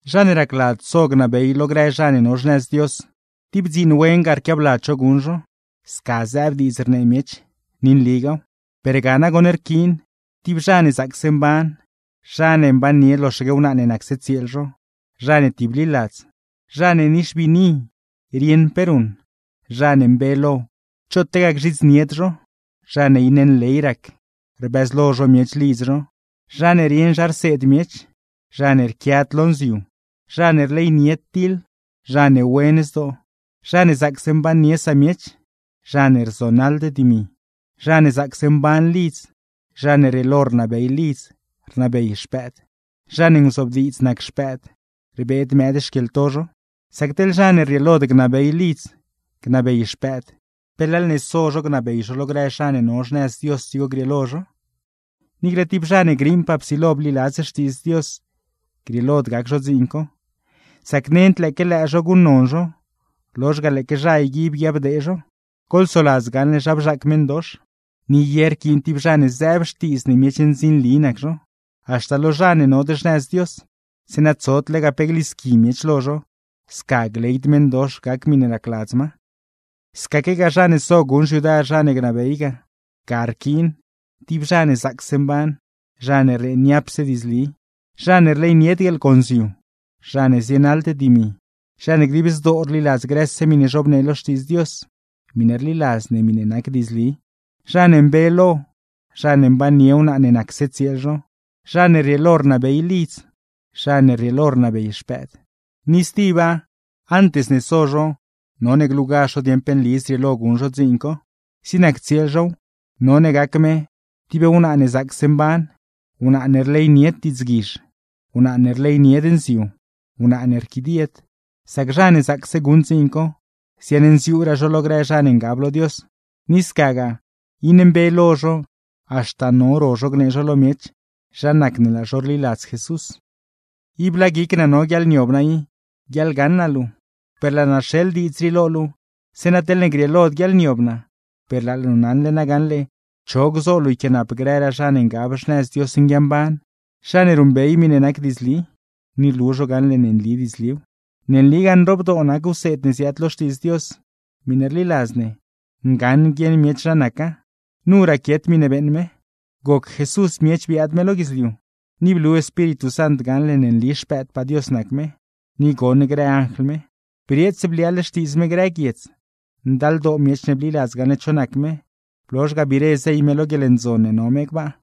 Zha ne racladz so gnabey zho lo grë zha ne no xnëz Dios, tib dziin wen ga rquiabladz zho guṉ zho. Sca zëëb diidz rnee miech; ni nligaaw. Per ga nagoṉ rquiin: tib zha ne zaacse mban, zha ne mbannie loxaque wnaa ne nacse tsieel zho, zha ne tibliladz, zha ne nixbiini, rieṉ pe ruṉ, zha ne mbe lo, choot lega gzhidznied zho, zha ne iṉe nley rac, rbëzlo zho miech lidz zho; zha ne rieṉ zha rseed miech, zha ne rquiad lo nziu, zha ne rleynied diḻ, zha ne wen zdoo, zha ne zaacse mbannie samiech, zha ne rzonaḻd dimi, zha ne zaacse mban lidz, zha ne rrieelo rnabey lidz, rnabey xpëëd, zha ne nguzobdiidz nac xpëëd, rbeed mëëd xquieḻto zho. Sac teḻ zha ne rrieelod gnabey lidz, gnabey xpëëd; ¿pe leḻ ne so zho gnabey zho lo grë zha ne no xnëz Dios dzigo grieelo zho? Niicle tib zha ne griiṉpaa psilo bliladz Xtiidz Dios grieelod gac zho dziin co; sac nend lëëque lëë zho guṉnon zho, lozh ga lëëque zha yguib guiabdee zho. Goḻsoladz gaṉle zha bzhaac meṉdox. Ni ye rquiin tib zha ne zëëb xtiidz ne miech ndzinli nac zho, haxta lo zha ne nod xnëz Dios; zeeṉa tsod lega pe glisqui miech lo zho, sca gleyd meṉdox gac miṉe racladz ma. Scaquegaa zha ne so guṉ xyudar zha ne gnabey ga, ga rquiin: tib zha ne zaacse mban, zha ne rnee niapse diidzli, zha ne rleynied guieḻgonziu, zha ne zienaḻd dimi, zha ne dib zdoo rliladz grëse miṉe zhobnee lo Xtiidz Dios (miṉe rliladz ne, miṉe nac diidzli), zha ne mbe lo, zha ne mbannie wnaa ne nacse tsieel zho, zha ne rrieelo rnabey lidz, zha ne rrieelo rnabey xpëëd. Ni stiba, antes ne so zho none glugazh zho dieṉ pe nli zrieelo guṉ zho dziin co. Zig nac tsieel zhow, none gac me: tib wnaa ne zaacse mban, wnaa ne rleynied diidzguizh, wnaa ne rleynied nziu, wnaa ne rquidied. Sac zha ne zaacse guṉ dziin co, ziaṉnziuuraa zho lo grë zha ne ngab lo Dios, ni scagaa iṉe mbe lo zho haxta no ro zho gnee zho lo miech zha nac ne laa zho rliladz Jesús. Ib laa guic naa no guiaḻniob naa i, guiaḻgaṉ naa luu; per laa naa rxeḻ diidz rii lo luu, zeeṉa teḻne grieelod guiaḻniob naa, per laa luu naṉle nagaṉle cho gzo luu yquiaanap grëraa zha ne ngab xnëz Dios nguiamban; zha ne ruṉbey miṉe nac diidzli, ni rlu zho gaṉle ne nli diidzliw. Ne nligaa nroobdoo nac wseed ne ziaad lo Xtiidz Dios, miṉe rliladz ne, ngaṉ guieṉ miech zha naca. Nu raquiet miṉe beeṉ me: Goc Jesús miech biaad me lo guidzliu, ni blu Espíritu Sant gaṉle ne nli Xpëëdpaa Dios nac me; ni goṉ grë anjl me. Brieets bliaaḻ Xtiidz me grë guiedz, ndaldoo miech ne bliladz gaṉle cho nac me, blozh ga biire zey me lo guieḻndzon ne no me gbaa.